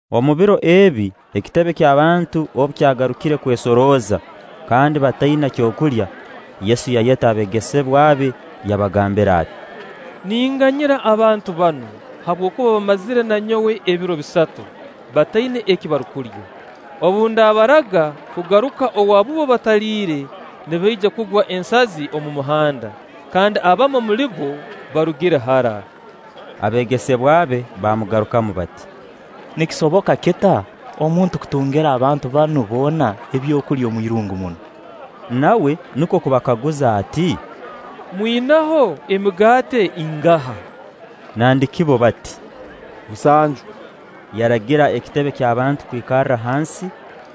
Omu biro ebi, ekitebe ky'abantu obu kyagarukire kwesorooza, kandi bataina kyokulya, Yesu yayeta abeegesebwa be, yabagambira ati: “Ninganyira abantu banu, habwokuba bamazire na nyowe ebiro bisatu, bataina eki barukulya; obu ndabaraga kugaruka owaabubo bataliire, nibaija kugwa ensazi omu muhanda; kandi abamu omuli bo barugire hara.” Abeegesebwa be baamugarukamu bati: “Nikisoboka kita omuntu kutungira abantu banu boona ebyokulya omuirungu munu?” Nawe nukwo kubakaguza ati: “Mwinaho emigaati ingaha?” Nandiki bbo bati: “Musanju.” Yaragira ekitebe ky'abantu kwikarra hansi;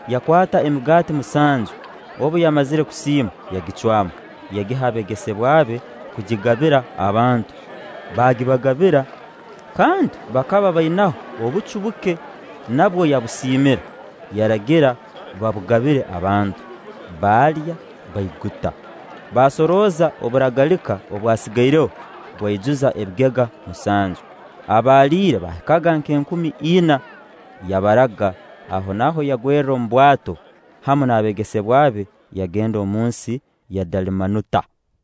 yakwata emigaati musanju, obu yamazire kusiima, yagicwamu, yagiha abeegesebwa be kugigabira abantu; baagibagabira. Kandi bakaba bainaho obucu buke; nabwo yabusiimira, yaragira babugabire abantu. Baalya, baiguta. Baasorooza oburagalika obwasigaireho, bwaijuza ebigega musanju. Abaaliire baahikaga nk'enkumi ina. Yabaraga; ahonaaho yagwerra omu bwato hamu n'abeegesebwa be, yagenda omu nsi ya Dalmanuta.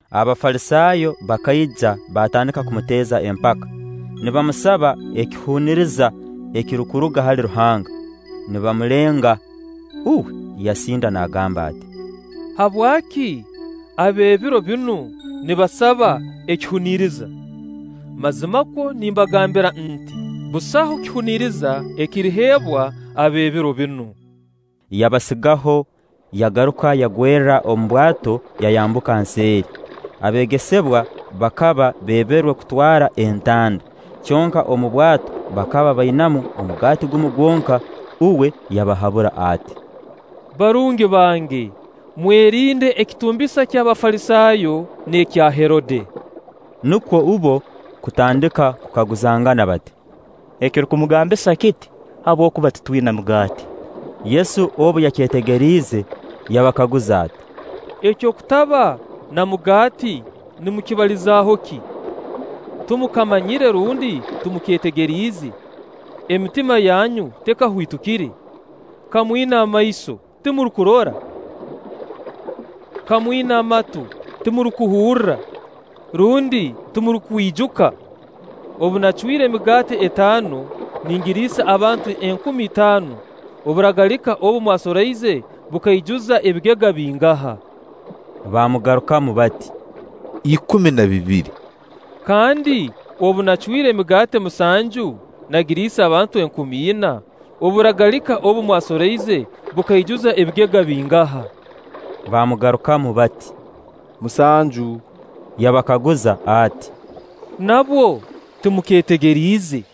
Abafalisaayo bakaija baatandika kumuteeza empaka, nibamusaba ekihuniriza ekirukuruga hali Ruhanga, nibamulenga. Uwe yasinda n'agamba ati: “Habwaki ab'ebiro binu nibasaba ekihuniriza? Mazimakwo nimbagambira nti: Busaho kihuniriza ekiriheebwa ab'ebiro binu.” Yabasigaho, yagaruka yagwerra omu bwato, yayambuka nseeri. Abeegesebwa bakaba beeberwe kutwara entanda, kyonka omu bwato bakaba bainamu omugaati gumu gwonka. Uwe yabahabura ati: “Barungi bange, mwerinde ekitumbisa ky'Abafalisaayo n'ekya Herode.” Nukwo bbo kutandika kukaguzangana bati: “Ekirukumugambisa kiti, habwokuba titwina mugaati.” Yesu obu yakyetegeriize, yabakaguza ati: “Eky'okutaba na mugaati nimukibalizaho ki? Timukamanyire rundi timukeetegeriize? Emitima yanyu tekahwitukire? Ka mwina amaiso, timurukurora? Ka mwina amatu, timurukuhurra? Rundi timurukwijuka? Obu naacwire emigaati etaano nagiriisa abantu enkumi itaano, oburagalika obu mwasoroize bukaijuza ebigega bingaha?” Baamugarukamu bati: “Ikumi na bibiri.” “Kandi obu nacwire emigaati musanju nagiriisa abantu enkumi ina, oburagalika obu mwasoroize bukaijuza ebigega bingaha?” Baamugarukamu bati: “Musanju.” Yabakaguza ati: “Nabwo timukeetegeriize?”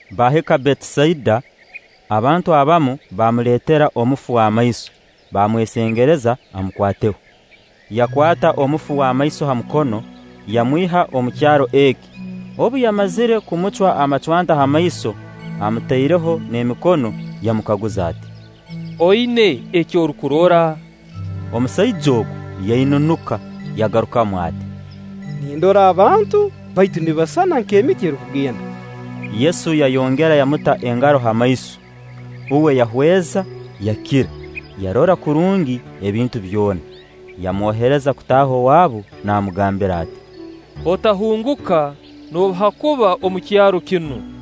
Baahika Betisaida. Abantu abamu baamuleetera omufu w'amaiso, baamwesengereza amukwateho. Yakwata omufu w'amaiso ha mukono, yamwiha omu kyaro eki; obu yamazire kumucwa amacwanta ha maiso, amutaireho n'emikono, yamukaguza ati: “Oina eki orukurora?” Omusaija ogu yainunuka, yagarukamu ati: “Nindora abantu; baitu nibasisana nk'emiti erukugenda.” Yesu yayongera yamuta engaro ha maiso. Uwe yahweza, yakira, yarora kurungi ebintu byona. Yamwohereza kutaaha owaabu, naamugambira ati: “Otahunguka noobu haakuba omu kyaro kinu.”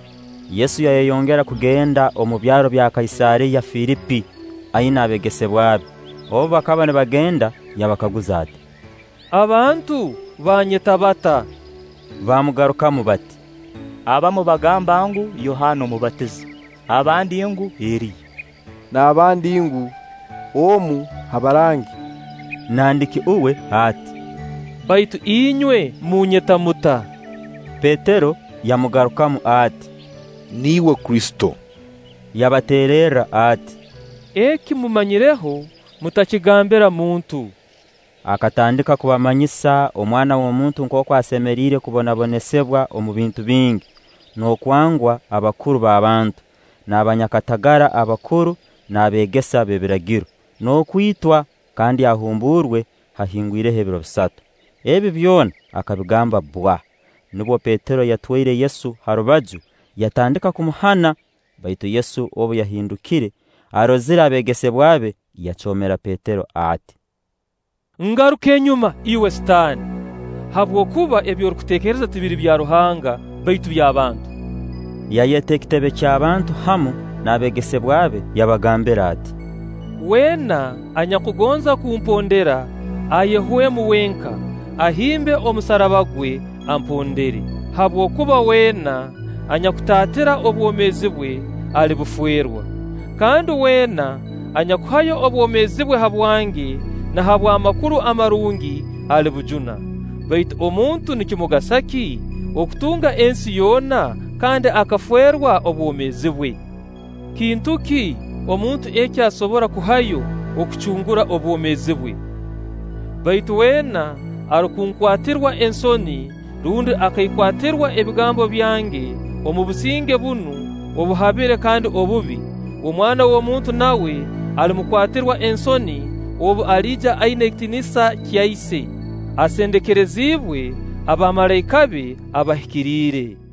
Yesu yayongera kugenda omu byaro bya Kaisaariya Filipi aina abeegesebwa be; obu bakaba nibagenda, yabakaguza ati: “Abantu baanyeta bata?” Baamugarukamu bati: “Abamu bagamba ngu: Yohaana Omubatiza; abandi ngu: Eriya; n'abandi ngu: Omu ha barangi.” Nandiki uwe ati: “Baitu inywe munyeta muta?” Petero yamugarukamu ati: “Niiwe Kristo.” Yabateererra ati: “Eki mummanyireho, mutakigambira muntu.” Akatandika kubamanyisa Omwana w'omuntu nkooku asemeriire kubonabonesibwa omu bintu bingi n'okwangwa abakuru b'abantu, n'abanyakatagara abakuru n'abeegesa b'ebiragiro, n'okwitwa kandi ahumburwe haahingwireho ebiro bisatu. Ebi byona akabigamba bbwa. Nubwo Petero yatwaire Yesu ha rubaju, yatandika kumuhana. Baitu Yesu obu yahindukire, arozire abeegesebwa be, yacoomera Petero ati: “Ngaruka enyuma iwe Sitaani! Habwokuba ebi orukuteekereza tibiri bya Ruhanga, baitu by'abantu.” Yayeta ekitebe ky'abantu hamu n'abeegesebwa be, yabagambira ati: “Weena anyakugonza kumpondera, ayehwemu wenka, ahimbe omusaraba gwe, ampondere. Habwokuba weena anyakutaatira obwomeezi bwe, alibufeerwa; kandi weena anyakuhayo obwomeezi bwe habwange na habw'Amakuru Amarungi, alibujuna. Baitu omuntu nikimugasa ki okutunga ensi yoona, kandi akafeerwa obwomeezi bwe? Kintu ki omuntu eki asobora kuhayo okucungura obwomeezi bwe? Baitu weena arukunkwatirwa ensoni rundi akaikwatirwa ebigambo byange omu businge bunu obuhabire kandi obubi, Omwana w'omuntu nawe alimukwatirwa ensoni obu aliija aina ekitiinisa kya Ise, asendekeriziibwe abamalaika be abahikiriire.”